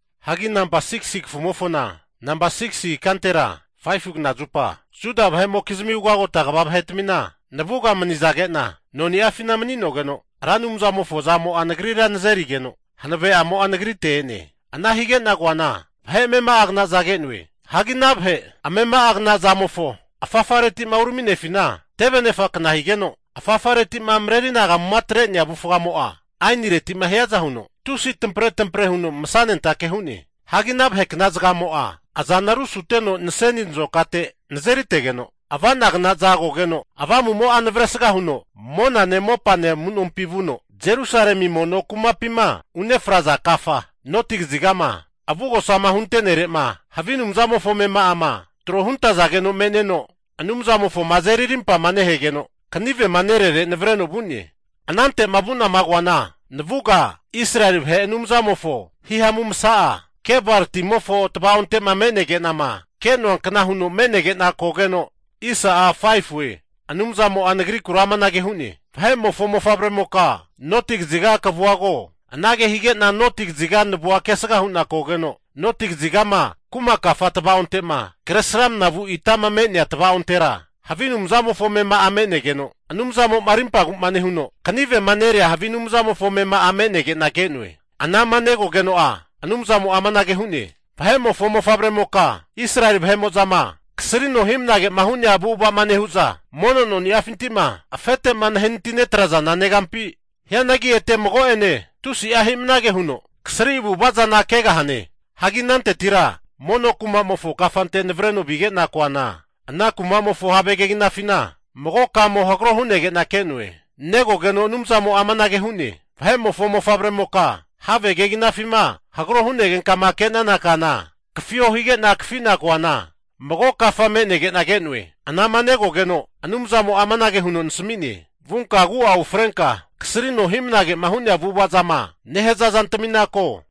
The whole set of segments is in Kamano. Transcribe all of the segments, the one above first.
Hagi namba 6si kafumofona namba 6si ikantera 5fu knazupa, Juda vahemokizmi ugagota vahe'tmina navuga manizage'na noni'afina mani'nogeno Ra Anumzamofo azamo'a nagrira nazerigeno hanave'amo'a nagrite e'ne. Ana hige'na koana vahe amema'agnaza ke'noe. Hagi ana vahe amema'agna zagamofo afafaretima urami'nefina teve anefakna higeno, afafareti'ma mareri anagamuma atre'nea avufgamo'a, ainireti'ma hiaza huno tusi tampretampare huno masanentake hu'ne. Hagi ana vahekna zagamo'a azana rusuteno naseni nazokate nazeritege'na ava'nagnaza kogeno, Avamu'mo'a navresga huno monane mopane amu'nompi vuno, Jerusalemi mono kumapima unefraza kafama noti kazigama avugosama hunte'nerema havi anumzamofo amema'ama tro huntazageno me'neno Anumzamofoma azeri arimpama nehegeno kanivema nerere navareno vu'ne. Anante'ma vu'nama koana navuga Israeli vahe Anumzamofo himamu masa'a Kebar timofo tavaonte'ma me'nege'nama ke'noankna huno me'nege'na kogeno, Anumzamo'a nagrikura amanage hu'ne, Vahe'mofo mofavremoka noti kaziga kavua ko. Anage hige'na noti kaziga navua kesga hu'na kogeno, noti kazigama kuma kafa tava'onte'ma kresramna vu itama me'nea tava'ontera havi anumzamofo amema'a me'negeno, Anumzamo'ma arimpagu'ma nehuno kanivema nerea havi anumzamofo amema'a me'negena ke'noe. Anama negogeno'a Anumzamo'a amanage hu'ne, Vahe'mofo mofavremoka, Israeli vahe'mo'zama kasrino hi'mnagema hu'nea avu'ava'ma nehu'za mono noni'afinti'ma afete'ma nahenati netrazana negampi? Hianagi ete mago'ene tusi'a hi'mnage huno kasri avu'ava zana kegahane. Hagi anantetira mono kumamofo kafante navareno vige'na koana, ana kumamofo have keginafina mago kamo hagro hunege'na ke'noe. Negogeno Anumzamo'a amanage hu'ne, Vahe'mofo mofavremoka, have keginafima hagro hu'negenkama ke'nana kana kafio higena kafina koana mago kafa me'negena ke'noe. Anama negogeno'a Anumzamo'a anage huno nasami'ne, Vunka agu'a ufrenka kasrino hi'mnage'ma hu'nea avu'avazama nehaza zantamina ko!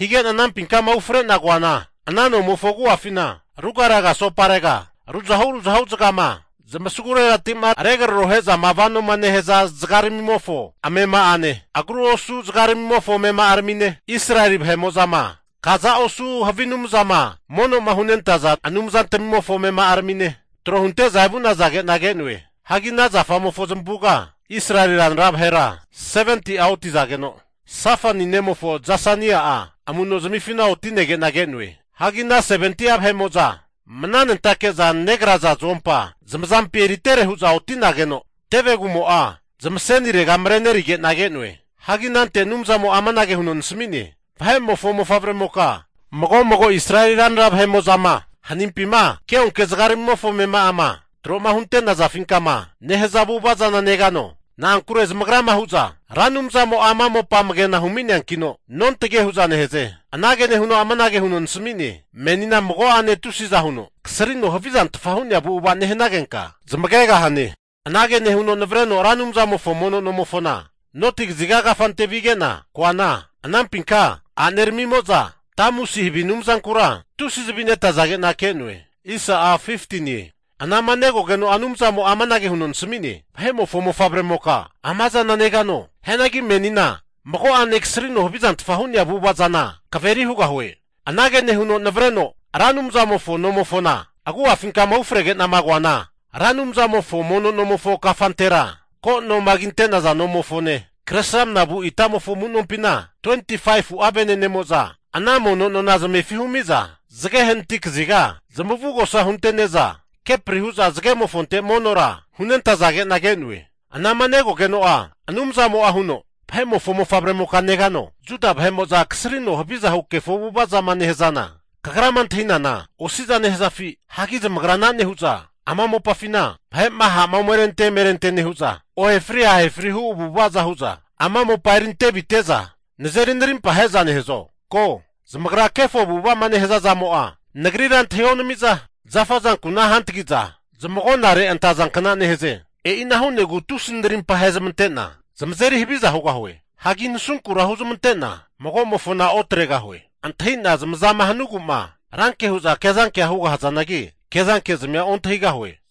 Hige'na anampinkama ufre'na koana, ana nomofo agu'afina rugaraga asoparega ruzahu ruzahu zagama zamasaguregati'ma regrarohe'zama vanoma nehaza zagaramimofo amema'ane, agru osu zagaramimofo amema'aramine, Israeli vahe'moma kaza osu havi anumzama mono'ma hu'nentaza anumzantmimofo amema'aramine tro hunte'za evu'nazage'na ke'noe. Hagi ana zamofo zamavuga Israeli ranra vahera 70'a otizageno, Safani nemofo Zasania'a amunoznifina oti'nege'na ke'noe. Hagi ana 70'a vahe'mo'za, mananentake'za negraza zuompa zamazampi eritere hu'za oti'nageno tevegumo'a zamasenirega marenerige'na ke'noe. Hagi anante Anumzamo'a amanage huno nasami'ne, Vahe'mofo mofavremoka, mago mago Israeli ranra vahe'mo'za'ma hanimpima keonke zagaramimofo amema'ama tro'ma hunte'nazafinkama nehaza avu'ava zana negano? Na'ankure zamagra hu'za Ra Anumzamo'a ama mopa amagena humi'neankino nontage hu'za nehaze! Anage nehuno amanage huno nasmi'ne, Menina mago'ane tusiza huno kasrino havizanfta hu'nea avu'ava nehanagenka zamagegahane. Anage nehuno navareno Ra Anumzamofo mono nomofona noti kaziga kafante vige'na, koana anampinka a'neramimo'za Tamusi havi anumzankura tusi zavi netazage'na ke'noe. Anama negogeno'a Anumzamo'a amanage huno nasami'ne, Vahe'mofo mofavremoka, ama zana negano? Hianagi menina mago'ane kasrino havizanfta hu'nea avu'ava zana kaveri hugahue. Anage nehuno navareno Ra Anumzamofo nomofona agu'afinka ufrege'nama koana, Ra Anumzamofo mono nomofo kafantera ko noma kinte'naza nomofone, kresramnama vu itamofo amu'nompina 25'a venenemo'za ana mono nona zamefi humiza zage hanati kaziga zamavugosa huntene'za kepri hu'za zagemofonte monora hunentazage'na ke'noe. Anama negogeno'a Anumzamo'a huno, Vahe'mofo mofavremoka negano? Juda vahe'mo'za kasrino haviza hu'nea kefo avu'ava'ma nehazana, kagrama antahinana osi'za nehazafi? Hagi zamagra ana nehu'za ama mopafi vahe'ma ha'ma omerente emerente nehu'za, ohefri ahefri hu avu'avaza hu'za ama mopa eri antevite'za nazeri narimpa ahe'za nehazo? Ko, zamagra kefo avu'ava'ma nehaza zamo'a, Nagrira antahionami'za zafa azankuna hantagi'za zamagonare antazankna nehaze. E'ina hu'negu tusi narimpa ahezmante'na zamazeri haviza hugahue. Hagi nasunkura huzmante'na magomofona otregahue. Antahina zamazama hanuegu'ma ranke hu'za kezankea hugahazanagi, kezankezmia ontahigahue.